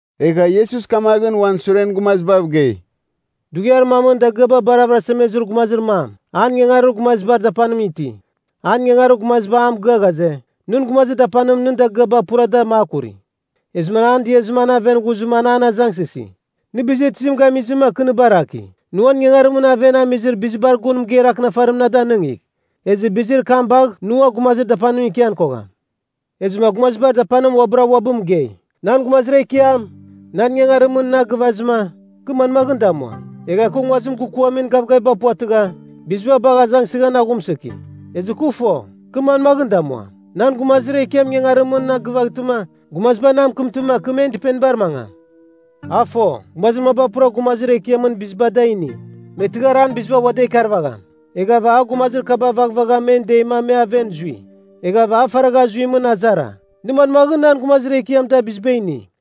Egha Iesus kamaghɨn uan suren gumazibav gei, “Dughiar mamɨn dagɨaba bar avɨrasemezir gumazir mam, an ingangarir gumazibar dapanim iti. An ingangarir gumaziba a mɨgɨa ghaze, ‘Nɨn gumazir dapanim nɨn dagɨaba pura da makuri.’ Ezɨma an an diazɨma an aven ghuzɨma an an azangsɨsi, ‘Nɨ bizir tizim gamizɨma kɨ nɨ baraki? Nɨ uan ingangarimɨn aven nɨ amizir bizibar gun mɨgeir akɨnafarim na danɨngigh. Ezɨ bizir kam bagh nɨ ua gumazir dapanimɨn ikian kogham.’ “Ezɨma gumazibar dapanim uabɨra uabɨ mɨgei, ‘Nan gumazir ekiam, nan ingangarimɨn na gɨvazɨma, kɨ manmaghɨn damuam? Egha kɨ nguazim gɨkuamin gavgaviba puvatɨgha, biziba bagh azangsɨghan aghumsɨki. Ezɨ kɨ fo, kɨ manmaghɨn damuam, nan gumazir ekiam ingangarimɨn na gɨvaghtɨma, gumaziba na mɨkɨmtɨma kɨ men dɨpenibar mangam.’ “A fo, gumazir maba pura gumazir ekiamɨn biziba da ini, me tɨghar an biziba ua da ikarvagham. Eghava a gumazir kaba vaghvagha men deima me aven zui. Eghava a faragha zuimɨn azara, ‘Nɨ manmaghɨn nan gumazir ekiam da biziba ini?’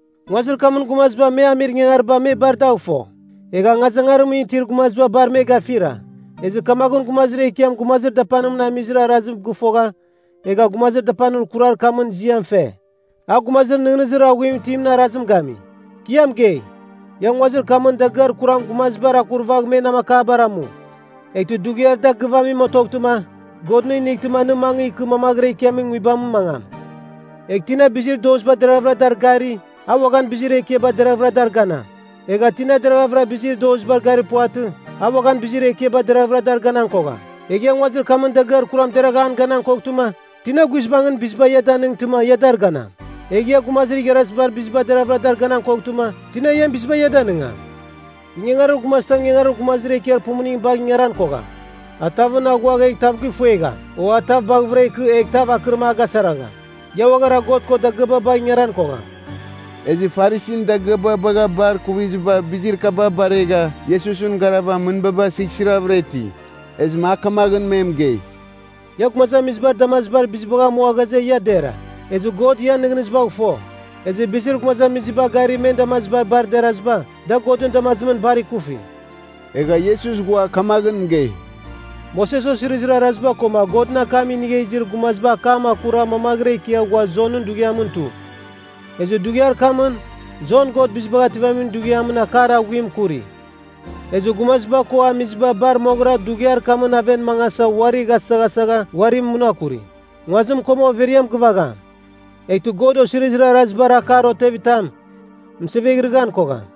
“Nguazir kamɨn gumaziba me amir ingangariba me bar dagh fo. Egha angazangarimɨn itir gumaziba bar me gafira. Ezɨ kamaghɨn gumazir ekiam gumazir dapanim amizir arazim gɨfogha, egha gumazir dapanir kurar kamɨn ziam fe. A gumazir nɨghnɨzir aghuim itimɨn arazim gami. “Kɨ ia mɨgei, ia nguazir kamɨn dagɨar kuram gumazibar akuravagh me namakabar amu. Eghtɨ dughiar da gɨvamim otoghtɨma, God nɨ inightɨma nɨ mangɨ ikɨ mamaghɨra ikiamin nguibamɨn mangam. “Egh tina bizir doziba deraghavɨra dar gari, a uaghan bizir ekiaba deraghvɨra dar ganam. Egha tina deraghavɨra bizir dozibar garir puvatɨ, a uaghan bizir ekiaba deraghavɨra dar ganan kogham. Egh ia nguazir kamɨn dagɨar kuram deragh an ganan koghtɨma, tina guizbangɨn biziba ia danɨngtɨma ia dar ganam? Egh ia gumazir igharazimɨn biziba deraghvɨra dar ganan koghtɨma, tina ian biziba ia danɨngam? “Ingangarir gumazitam ingangarir gumazir ekiar pumuning bagh ingaran kogham. A tavɨn aghuagh egh tav gifuegham, o a tav baghɨvɨra ikɨ egh tav akɨrim a gasaragham. Ia uaghara God ko dagɨaba bagh ingaran kogham.” Ezɨ Farisin dagɨaba bagha bar ikuvizɨba bizir kaba baregha Iesusɨn garav mɨnbaba sighsiravɨra iti. Ezɨma a kamaghɨn me mɨgei, “Ia gumazamizibar damazibar bizibagh amua ghaze ia dera. Ezɨ God ian nɨghnɨzibagh fo. Ezɨ bizir gumazamiziba gari men damazibar bar deraziba, da Godɨn damazimɨn bar ikufi.” Egha Iesus ghua kamaghɨn mɨgei, “Moses Osirizir Araziba koma Godɨn akam inigha izir gumazibar akam akura mamaghɨra ikia ghua Jonɨn dughiamɨn tu. Ezɨ dughiar kamɨn, Jon God Bizibagh Ativamin Dughiamɨn akar aghuim kuri. Ezɨ gumaziba ko amiziba bar moghɨra dughiar kamɨn aven mangasa uari ghasaghasagha uari munakuri. Nguazim koma overiam gɨvagham. Eghtɨ God osizirir arazibar akar otevitam, mɨseveghɨrɨghan kogham.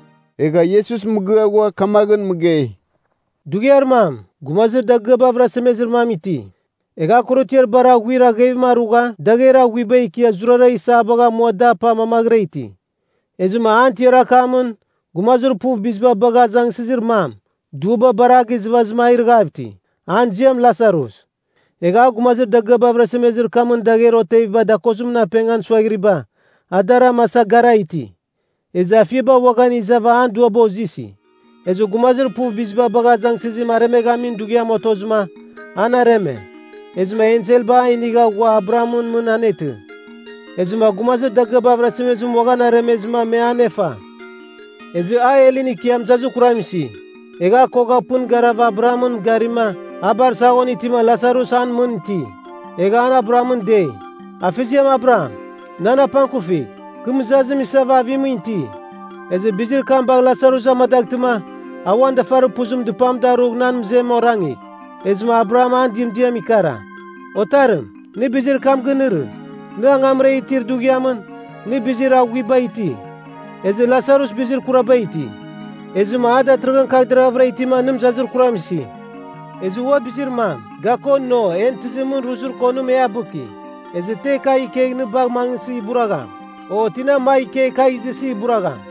Egha Iesus mɨgɨa ghua kamaghɨn mɨgei, “Dughiar mam, gumazir dagɨaba avɨrasemezir mam iti. Egha a korotiar bar aghuir aghevim arugha dagher aghuiba ikia zurara isabagh amua da apa mamaghɨra iti. Ezɨma an tiar akamɨn, gumazir puv biziba bagha azangsɨzir mam, duaba bar a gizɨvazɨma a irɨghav iti, an ziam Lasarus. Egh gumazir dagɨaba avɨrasemezir kamɨn dagher oteviba dakozimɨn apengan suaghiriba, a dar amasa gara iti. Ezɨma afiaba uaghan izava an duaba ozɨsi. “Ezɨ gumazir puv biziba bagha azangsɨzim aremeghamin dughiam otozɨma, an areme. Ezɨma enselba a inigha ghua Abrahamɨn mɨn anetɨ. Ezɨma gumazir dagɨaba avɨrasemezim uaghan aremezɨma me anefa. Ezɨ a helɨn ikia mɨzazir kuram isi. Egha a kogha pɨn garava Abrahamɨn garima, a bar saghon itima Lasarus an mɨn iti. Egha an Abrahamɨn dei, ‘Afeziam Abraham, nan apangkufigh. Kɨ mɨzazim isava avimɨn iti. Ezɨ bizir kam bagh Lasarus amadaghtɨma, a uan dafarir puzim dɨpam darugh nan mɨzem orangigh.’ “Ezɨma Abraham an dɨmdiam ikara, ‘Otarim, nɨ bizir kam ginɨrɨ, nɨ angamra itir dughiamɨn, nɨ bizir aghuiba iti. Ezɨ Lasarus bizir kuraba iti. Ezɨma a datɨrɨghɨn kagh deraghavɨra itima nɨ mɨzazir kuram isi. Ezɨ ua bizir mam, ga ko no en tɨzimɨn ruzir konim e abɨki. Ezɨ te kagh ikegh nɨ bagh mangɨsɨ iburagham, o tina magh ikegh kagh izɨsɨ iburagham.’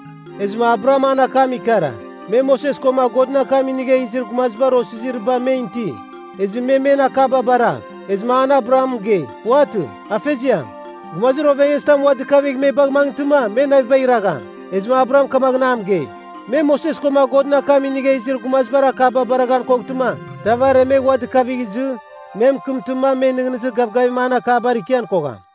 “Ezɨma Abraham an akam ikara, ‘Me Moses koma Godɨn akam inigha izir gumazibar osiziriba men iti. Ezɨ me men akaba baragh.’ “Ezɨma an Abraham mɨgei, ‘Puvatɨ, Afeziam. Gumazir ovengezitam ua dɨkavigh me bagh mangɨtɨma, me navibagh iragham.’ “Ezɨma Abraham kamaghɨn a mɨgei, ‘Me Moses koma Godɨn akam inigha izir gumazibar akaba baraghan koghtɨma, tav aremegh ua dɨkavigh izɨ, me mɨkɨmtɨma, me nɨghnɨzir gavgavimɨn an akabar ikian kogham.’”